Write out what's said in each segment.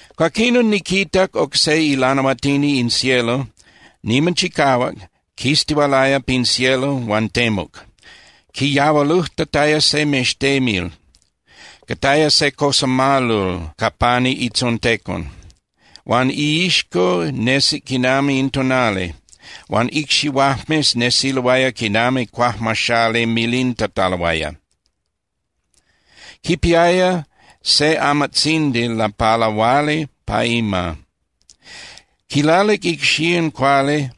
Cuaquinon niquitac oc se ilanahuatini in cielo niman chicahuac quistihualaya pin cielo huan temuc. Quiyahualujtataya se mextemil, cataya se cosamalol ca pani itzontecon, huan iixco nesic quinami in tonali, huan icxihuajmes nesiloaya quinami cuajmaxali milintataloaya. Quipiaya se amatzindi lapalahuali pa ima. Quilalic icxían cuali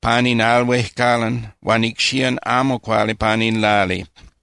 pani in al huejcalan huan icxían amo cuali pani in lali.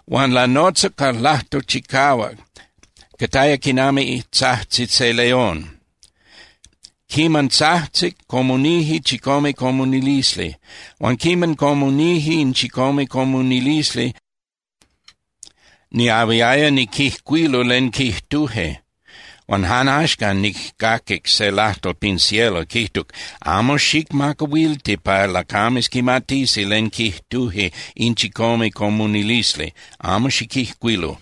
Huan lanotzac ca lajtol chicahuac, cataya quinami tzajtzi se león. Quiman tzajtzic, comunije chicome comunilisli. Huan quiman comunije in chicome comunilisli, niahuiaya niquijcuilu len quijtuje. Huan jan axcan nijcaquic se lajtol pin cielo quijtuc: —Amo xicmacahuilti pa lacames quimatisi len quijtuje in chicome comunilisli, amo xiquijcuilu.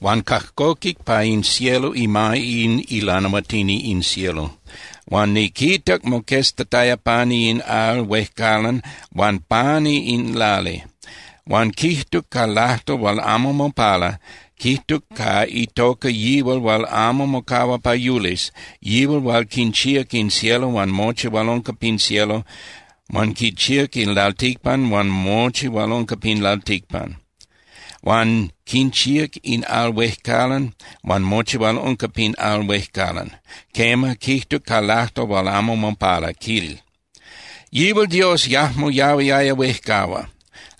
Huan cajcoquic pa in cielo ima in ilanahuatini in cielo hual niquitac moqueztataya pani in al huejcalan huan pani in lali. Huan quijtuc ca lajtol hual amo mopala, quijtuc ca itoca yihual hual amo mocahua pa yulis, yihual hual quinchíac in cielo huan mochi hual unca pin cielo. Huan quinchíac in lalticpan huan mochi hual unca pin lalticpan. Huan quinchíac in al huejcalan huan mochi hual unca pin al huejcalan. Quema, quijtuc ca lajtol hual amo mopala, quil: —Yihual Dios yajmo yahuiaya huejcahua.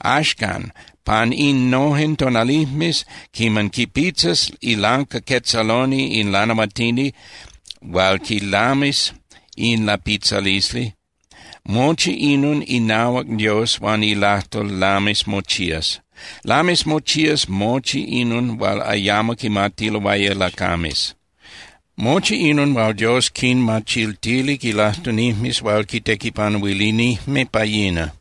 Axcan pan innojen tonalijmes quiman quipitzas ilancaquetzaloni in lanahuatini hual quilamis in lapitzalisli, mochi inon inahuac Dios huan ilajtol lamis mochías. Lamis mochías mochi inon hual ayamo quimatiloaya lacames, mochi inon hual Dios quinmachiltilic ilajtunijmes hual quitequipanuilinijme pa yina.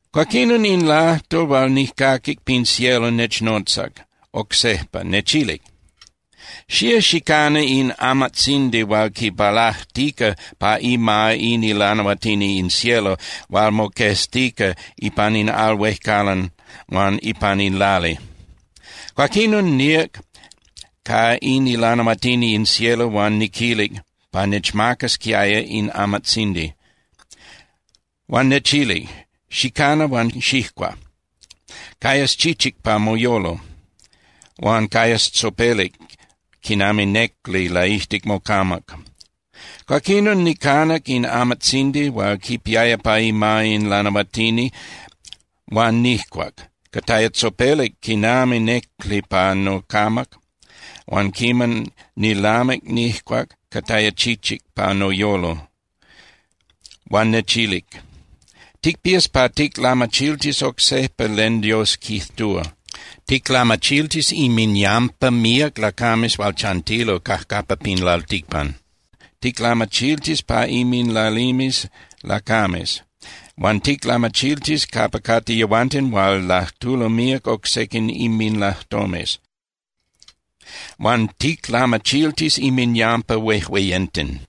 Cuaquinon, in lajtol hual nijcaquic pin cielo nechnotzac oc sejpa, nechilic: —Xía xicana in amatzindi hual quipalajtica pa ima in ilanahuatini in cielo hual moqueztica ipan in al huejcalan huan ipan in lali. Cuaquinon níac ca in ilanahuatini in cielo huan niquilic pa nechmacasquiaya in amatzindi. Huan nechilic: —Xicana huan xijcua. Cayas chichic pa moyolo, huan cayas tzopelic quinami néculi laijtic mocamac. Cuaquinon nicanac in amatzindi hual quipiaya pa ima in lanahuatini huan nijcuac. Cataya tzopelic quinami néculi pa nocamac, huan quiman nilamic nijcuac cataya chichic pa noyolo. Huan nechilic: —Ticpías pa ticlamachiltis oc sejpa len Dios quijtúa. Ticlamachiltis inminyampa míac lacames hual chantilo cajcapa pin lalticpan. Ticlamachiltis pa inminlalimes lacames. Huan ticlamachiltis capa cate yehuanten hual lajtulo míac oc sequin inminlajtomes. Huan ticlamachiltis inminyampa huejueyenten.